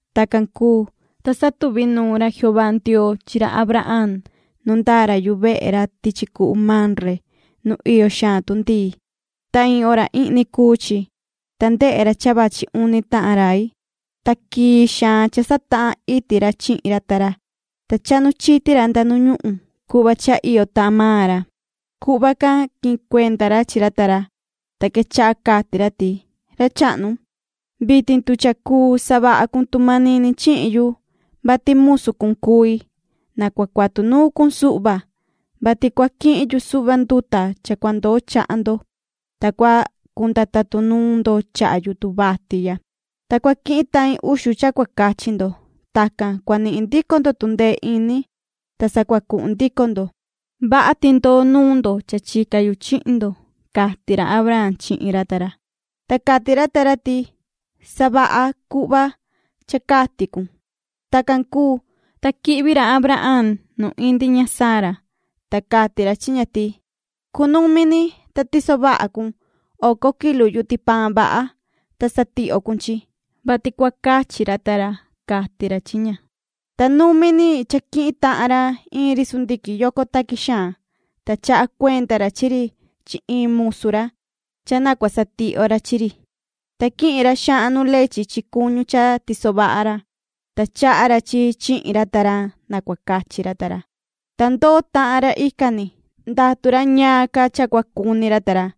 Tacan cuu, ta satuvi nuun ra Jehová Ndioo chi ra Abraham nu ndaa ra yuvehe ra tichi cuhu Mamre nu iyo xaan tundii, ta iin hora ihni cuu chi. Ta ndehe ra cha vachi uni tahan rai, ta quii xaan cha satahan iti ra chihin ra ta ra. Ta chahnu chiti ra nda nu ñuhun cuhva cha iyo tahan maan ra. Cuhva can quihin cuenda ra chi ra ta ra. Ta quechaha cati ra ti: ―Ra chahnu, vitin tu cha cuu savaha cun tu manini chihin yu, vati musu cun cui, na cua cuatu nuun cun suhva, vati cua quihin yu suhva nduta cha cua ndoo chaha ndo, ta cua cunda tatun nuun ndo chaha yutun vati ya. Ta cua quihin tahin uxu cha cua cachi ndo. Tacan cua nihin ndico ndo tundee ini, ta sa cua cuhun ndico ndo. Vaha ti ndoo nuun ndo cha chica yu chihin ndo ―cati ra Abraham chihin ra ta ra. Ta cati ra ta ra ti: ―Savaha cuhva cha cati cun. Tacan cuu, ta quihvi ra Abraham nu indi ña Sara, ta cati ra chi ña ti: ―Cunumi ni, ta tiso vaha cun oco kilu yuti paan vaha, ta satihyo cun chi, vati cua cachi ra ta ra ―cati ra chi ña. Ta numi ni cha quihin tahan ra iin ri sundiquin yoco taqui xaan, ta chaha cuenda ra chi ri chi iin musu ra cha na cua satihyo ra chi ri. Ta quihin ra xahan nu lechi chi cuñu cha tiso vaha ra, ta chaha ra chi chihin ra ta ra na cua cachi ra ta ra, ta ndoo tahan ra ican ni, ndatu ra ñaan ca cha cua cuni ra ta ra.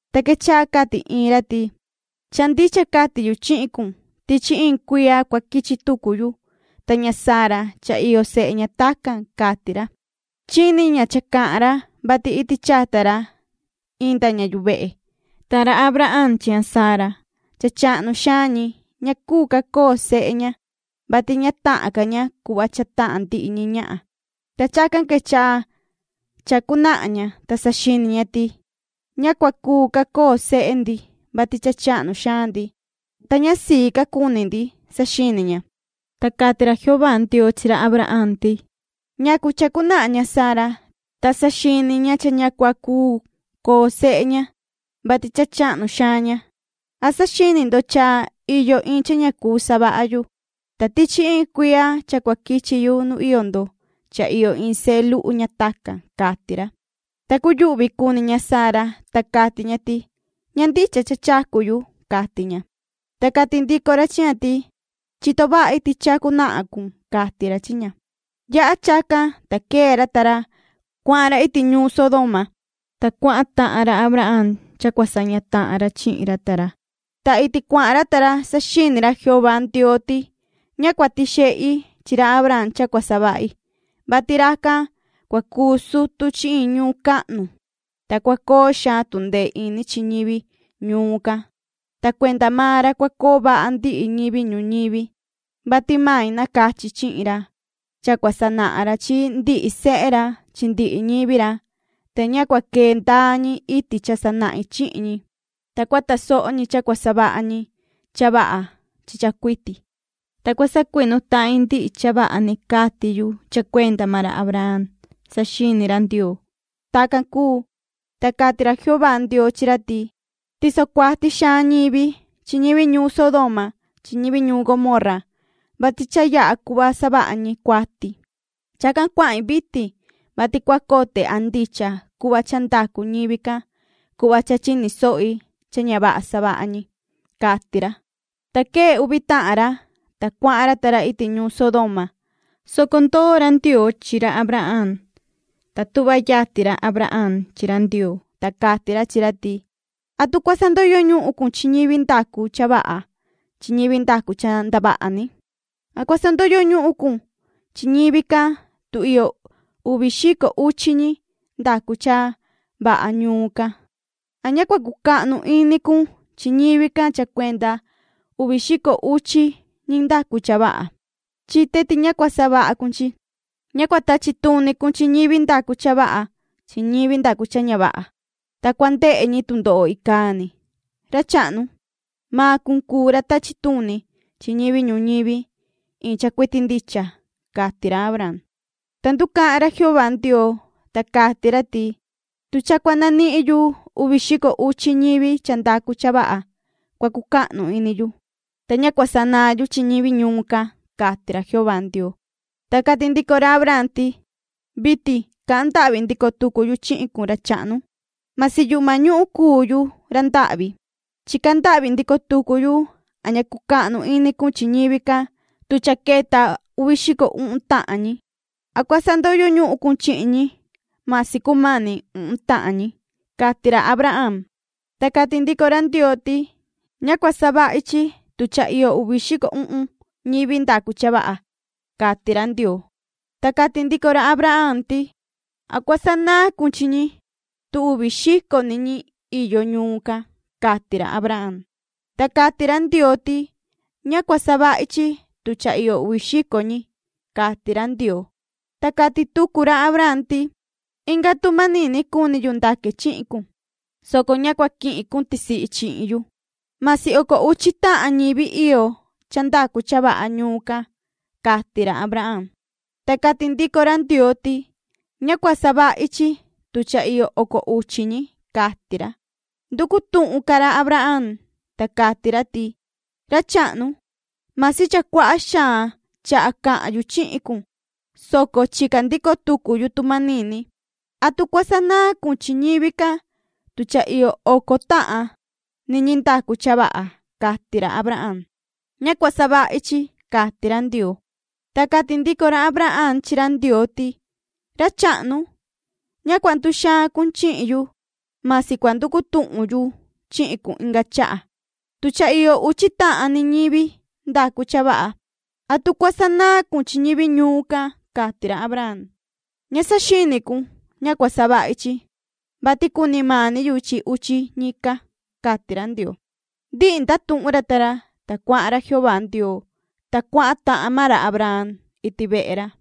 Ta quechaha cati iin ra ti: ―Cha ndicha cati yu chihin cun. Tichi iin cuiya cua quichi tucu yu. Ta ña Sara cha iyo sehe ña tacan ―cati ra. Chini ña cha cahan ra, vati iti chata ra inda ña yuvehe. Ta ra Abraham chi ña Sara, cha chahnu xaan ñi. Ña cuu ca coo sehe ña, vati ña tahan ca ña cuhva cha tahan ndihi ñi ñahan. Ta chacan quechaha chacu nahan ña, ta saxini ña ti: “Ña cua cuu ca coo sehe ndi, vati cha chahnu xaan ndi, ta ña sii ca cuni ndi”, saxini ña. Ta cati ra Jehová Ndioo chi ra Abraham ti: ―¿Ñacu chacu nahan ña Sara, ta saxini ña cha ña cua cuu coo sehe ña, vati cha chahnu xaan ña? ¿An saxini ndo cha iyo iin cha ña cuu savaha yu? Ta tichi iin cuiya cha cua quichi yu nu iyo ndo cha iyo iin sehe luhu ña tacan ―cati ra. Ta cuyuhvi cuni ña Sara, ta cati ña ti: ―Ña ndicha cha chacu yu ―cati ña. Ta cati ndico ra chi ña ti: ―Chito vahi ti chacu nahan cun ―cati ra chi ña. Yaha chacan, ta quee ra ta ra, cuahan ra iti ñuun Sodoma, ta cuahan tahan ra Abraham cha cua saña tahan ra chihin ra ta ra. Ta iti cuahan ra ta ra saxini ra Jehová Ndioo ti: “Ña cua tixehi chi ra Abraham cha cua savahi, vati racan cua cuu sutu chi iin ñuun cahnu, ta cua coo xaan tundee ini chi ñivi ñuun can, ta cuenda maan ra cua coo vaha ndihi ñivi ñuñivi, vati mai nacachi chihin ra. Cha cua sanahan ra chi ndihi sehe ra chi ndihi ñivi ra, ta ña cua quee ndaa ñi iti cha sanahin chihin ñi, ta cua tasoho ñi cha cua savaha ñi cha vaha chi cha cuiti, ta cua sacuinu tahin ndihi cha vaha ni cati yu cha cuenda maan ra Abraham”, saxini ra Ndioo. Tacan cuu, ta cati ra Jehová Ndioo chi ra ti: ―Tiso cuati xaan ñivi chi ñivi ñuun Sodoma chi ñivi ñuun Gomorra, vati cha yaha cuhva savaha ñi cuati. Chacan cuahin vitin, vati cua cote a ndicha cuhva cha ndacu ñivi can cuhva cha chini sohi cha ña vaha savaha ñi ―cati ra. Ta quee uvi tahan ra, ta cuahan ra ta ra iti ñuun Sodoma, soco ndoo ra Ndioo chi ra Abraham. Ta tuhva yatin ra Abraham chi ra Ndioo, ta cati ra chi ra ti: ―¿Atu cua sandoyo ñuhun cun chi ñivi ndacu cha vaha chi ñivi ndacu cha ndavaha ni? ¿An cua sandoyo ñuhun cun chi ñivi can tu iyo uvi xico uchi ñi ndacu cha vaha ñuun can? ¿An ña cua cuu cucahnu ini cun chi ñivi can cha cuenda uvi xico uchi ñi ndacu cha vaha? Chite ti ña cua savaha cun chi. Ña cua tachi tuni cun chi ñivi ndacu cha vaha chi ñivi ndacu cha ña vaha, ta cua ndehe ñi tundoho icaa ni. Ra chahnu, maan cun cuu ra tachi tuni chi ñivi ñuñivi iin cha cuiti ndicha ―cati ra Abraham. Ta nducahan ra Jehová Ndioo, ta cati ra ti: ―Tu cha cua nanihin yu uvi xico uchi ñivi cha ndacu cha vaha, cua cucahnu ini yu, ta ña cua sanaan yu chi ñivi ñuun can ―cati ra Jehová Ndioo. Ta cati ndico ra Abraham ti: ―Vitin cahan ndahvi ndico tucu yu chihin cun, ra chahnu. Masi yuhma ñuhun cuu yuhu ra ndahvi, chica ndahvi ndico tucu yu a ña cucahnu ini cun chi ñivi can tu cha queta uvi xico uhun tahan ñi. ¿An cua sandoyo ñuhun cun chi ñi masi cumani uhun tahan ñi? ―cati ra Abraham. Ta cati ndico ra Ndioo ti: ―Ña cua savahi chi tu cha iyo uvi xico uhun ñivi ndacu cha vaha ―cati ra Ndioo. Ta cati ndico ra Abraham ti: ―¿An cua sanaan cun chi ñi tu uvi xico ni ñivi iyo ñuun can? ―cati ra Abraham. Ta cati ra Ndioo ti: ―Ña cua savahi chi tu cha iyo uvi xico ñi ―cati ra Ndioo. Ta cati tucu ra Abraham ti: ―Inga tu manini cuni yu ndaque chihin cun, soco ña cua quihin cun tisihi chihin yu. Masi oco uchi tahan ñivi iyo cha ndacu cha vaha ñuun can ―cati ra Abraham. Ta cati ndico ra Ndioo ti: ―Ña cua savahi chi tu cha iyo oco uchi ñi ―cati ra. Nducu tuhun ca ra Abraham, ta cati ra ti: ―Ra chahnu, masi cha cuaha xaan chaha cahan yu chihin cun, soco chica ndico tucu yu tu manini. ¿Atu cua sanaan cun chi ñivi can tu cha iyo oco tahan ni ñi ndacu cha vaha? ―cati ra Abraham. ―Ña cua savahi chi ―cati ra Ndioo. Ta cati ndico ra Abraham chi ra Ndioo ti: ―Ra chahnu, ña cua nduxaan cun chihin yu. Masi cua nducu tuhun yu chihin cun inga chaha, tu cha iyo uchi tahan ni ñivi ndacu cha vaha. ¿Atu cua sanaan cun chi ñivi ñuun can? ―cati ra Abraham. ―Ña saxini cun. Ña cua savahi chi, vati cuni mani yu chi uchi ñican ―cati ra Ndioo. Ndihi ndatuhun ra ta ra, ta cuahan ra Jehová Ndioo, ta cuahan tahan maan ra Abraham iti vehe ra.